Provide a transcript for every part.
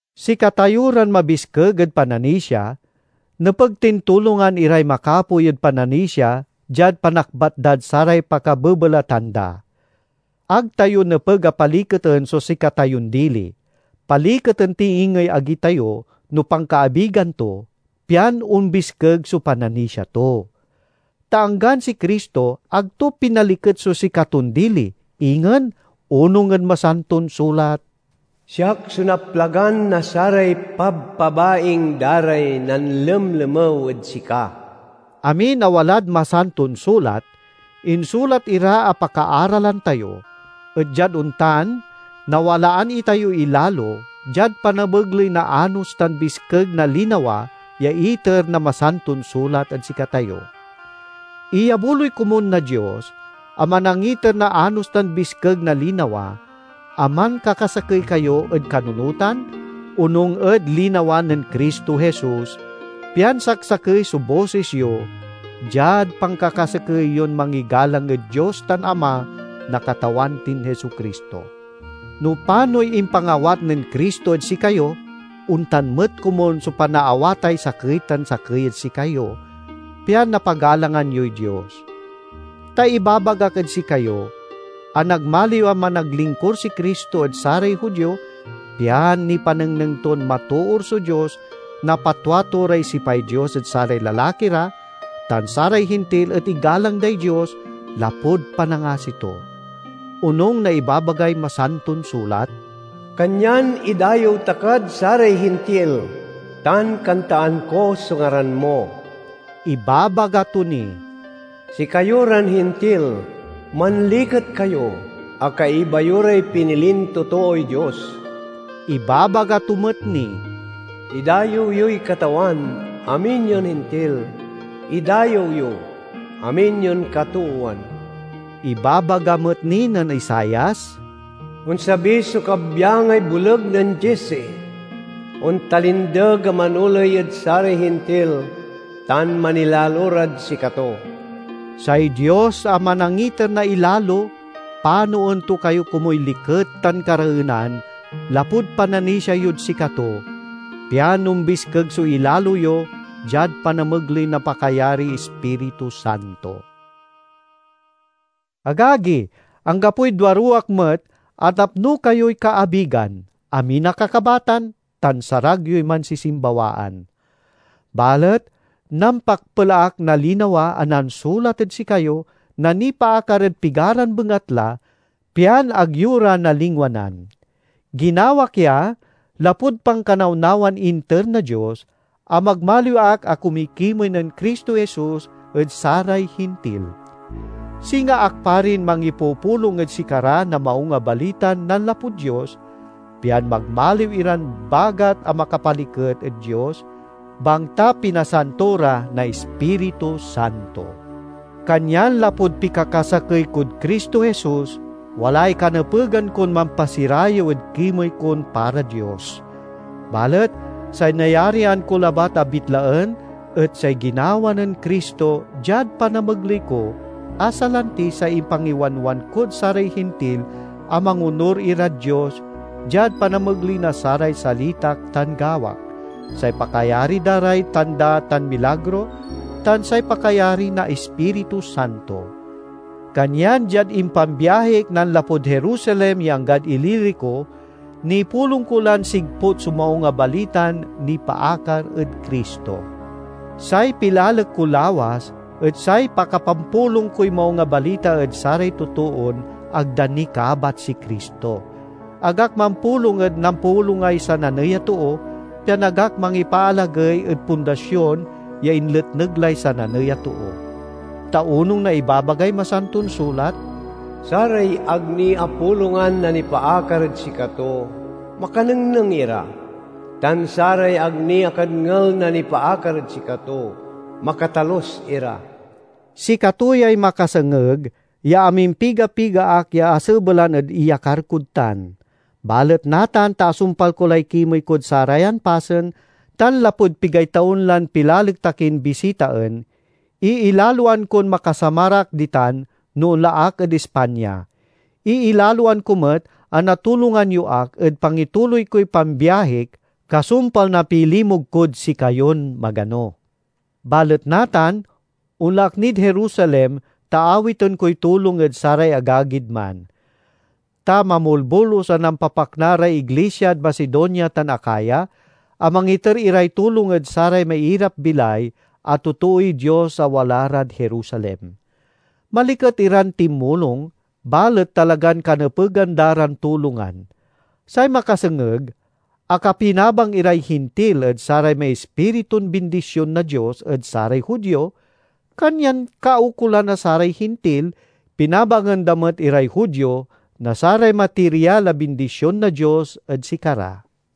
Sikatayo ran mabiskeg ed pananisia nepeg tin tulongan iray makapoy ed pananisia diad panakbat dad saray pakabebelatan da. Ag tayo nepeg a paliketen so sikatayon dili. Paliketen ti ingey agi tayo no pankaabigan to, pian ombiskeg so pananisia to. Ta anggan si Cristo, ag to pinaliket so sikaton dili. Ingen onung ed Masanton Sulat, "Siak so naplagan na saray pabpabaing da ray nanlemlemew ed sika." Amin a walad Masanton Sulat insulat ira a pakaaralan tayo, et diad ontan nawalaan itayoy ilalo diad panamegley na anos tan biskeg na linawa ya iter na Masanton Sulat ed sikatayo. Iyabuloy komun na Dios a manangiter na anos tan biskeg na linawa, a mankakasakey kayo ed kanunotan, onung ed linawa nen Cristo Jesus, pian saksakey so bosis yo diad pankakasakey yon mangigalang ed Dios tan Ama na Katawan tin Jesu-Cristo. No panoy impangawat nen Cristo ed sikayo, ontan met komun so panaawatay sakey tan sakey ed sikayo, pian napagalangan yoy Dios. Ta ibabagak ed sikayo a nagmaliw a managlingkur si Cristo ed saray Judio, pian nipanengneng ton matoor so Dios, napatwa to ray sipay Dios ed saray lalaki ra, tan saray Hintil et igalang day Dios lapud panangasi to. Onung na ibabagay Masanton Sulat, "Kanyan idayew ta kad saray Hintil, tan kantaan ko so ngaran mo." Ibabaga to ni, "Sikayo ran Hintil, manliket kayo, a kaiba yo ray pinilin totooy Dios!" Ibabaga to met ni, "Idayew yoy Katawan, amin yon Hintil, idayew yo, amin yon katoowan!" Ibabaga met ni nen Isaias, "Onsabi so kabyangay boleg nen Jesse, ontalindeg a manoley ed saray Hintil, tan manilalo rad sikato." Say Dios a manangiter na ilalo panoen to kayo komuy liket tan kareenan lapud pananisia yod sikato, pian ombiskeg so ilalo yo diad panamegley na pakayariy Ispiritu Santo. Agagi, anggapoy duaruwak met a napno kayoy kaabigan, amin a kakabatan, tan sarag yoy mansisimbawaan. Balet nampakpel ak na linawa a nansulat ed sikayo na nipaakar ed pigaran bengatla, pian ag yo ra nalingwanan. Ginawak ya lapud pankanawnawan inter na Dios, a magmaliw ak a kumikimey nen Cristo Jesus ed saray Hintil. Singa ak parin mangipupulong ed sikara na Maung a Balitan nanlapud Dios, pian magmaliw iran bagat a makapaliket ed Dios, bangta pinasanto ra na Ispiritu Santo. Kanyan lapud pikakasakey kod Cristo Jesus, walay kanepegan kon mampasirayew ed kimey kon para Dios. Balet say nayarian ko labat a bitlaen et say ginawa nen Cristo diad panamegley ko, a salanti say impangiwanwan kod saray Hintil a mangonur irad Dios diad panamegley na saray salitak tan gawak, say pakayari da ray tanda tan milagro, tan say pakayari na Ispiritu Santo. Kanyan diad impambiahik nanlapud Jerusalem ya anggad Ilirico, nipulong ko lan sigput so Maung a Balitan nipaakar ed Cristo. Say pilalek ko lawas et say pakapampulong koy Maung a Balita ed saray totoon ag da ni kabat si Cristo; ag ak mampulong ed nampulongay sananey a too, pian ag ak mangipaalagey ed pundasion ya inletneg lay sananey a too. Ta onung na ibabagay Masanton Sulat, "Saray ag ni apulongan na nipaakar ed sikato makanengneng ira, tan saray ag ni akadngel na nipaakar ed sikato makatalus ira." Sikato yay makasengeg ya amimpiga-piga ak ya asebelan ed iyakar kod tan. Balet natan ta asumpal ko lay kimey kod sarayan pasen, tan lapud pigay taon lan pilalek ta kin bisitaen, iilaloan kon makasamar ak ditan no onla ak ed Espanya. Iilaloan ko met a natulongan yo ak ed pangituloy koy pambiahik, kasumpal na pilimug kod sikayon magano. Balet natan, onla ak nid Jerusalem ta awiten koy tulong ed saray agagid man. Ta mamolbolus a nampapakna ray iglisiad Macedonia tan Acaya a mangiter iray tulong ed saray mairap-bilay a totooy Dios a wala rad Jerusalem. Maliket iran tinmulong, balet talagan kanepegan da ran tulongan. Say makasengeg, akapinabang iray Hintil ed saray maispiritun bindision na Dios ed saray Judio, kanyan kaukolan a saray Hintil pinabangen da met iray Judio na saray matirial a bindision na Dios ed sikara.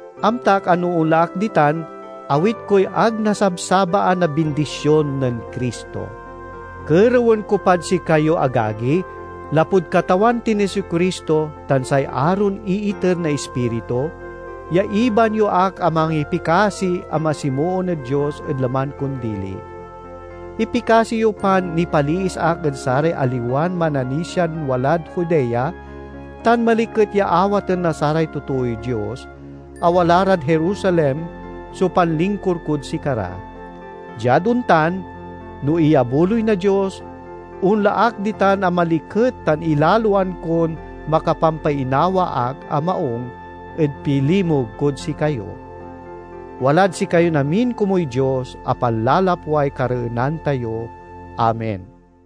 Amtak a no onla ak ditan awit koy ag nasabsabaan a bindision nen Cristo. Kerewen ko pad sikayo, agagi, lapud Katawan tin Jesu-Cristo tan say aron iiter na Ispiritu, ya ibaan yo ak a mangipikasi a masimoon ed Dios ed laman kon dili. Ipikasi yo pan nipaliis ak ed saray aliwan mananisian walad Judea, tan maliket ya awaten na saray totooy Dios a wala rad Jerusalem so panlingkur kod sikara. Diad ontan, no iyabuloy na Dios, onla ak ditan a maliket tan ilaloan kon makapampainawa ak a maung ed pilimug kod sikayo. Walad sikayon amin komuy Dios a panlalapway kareenan tayo. Amen.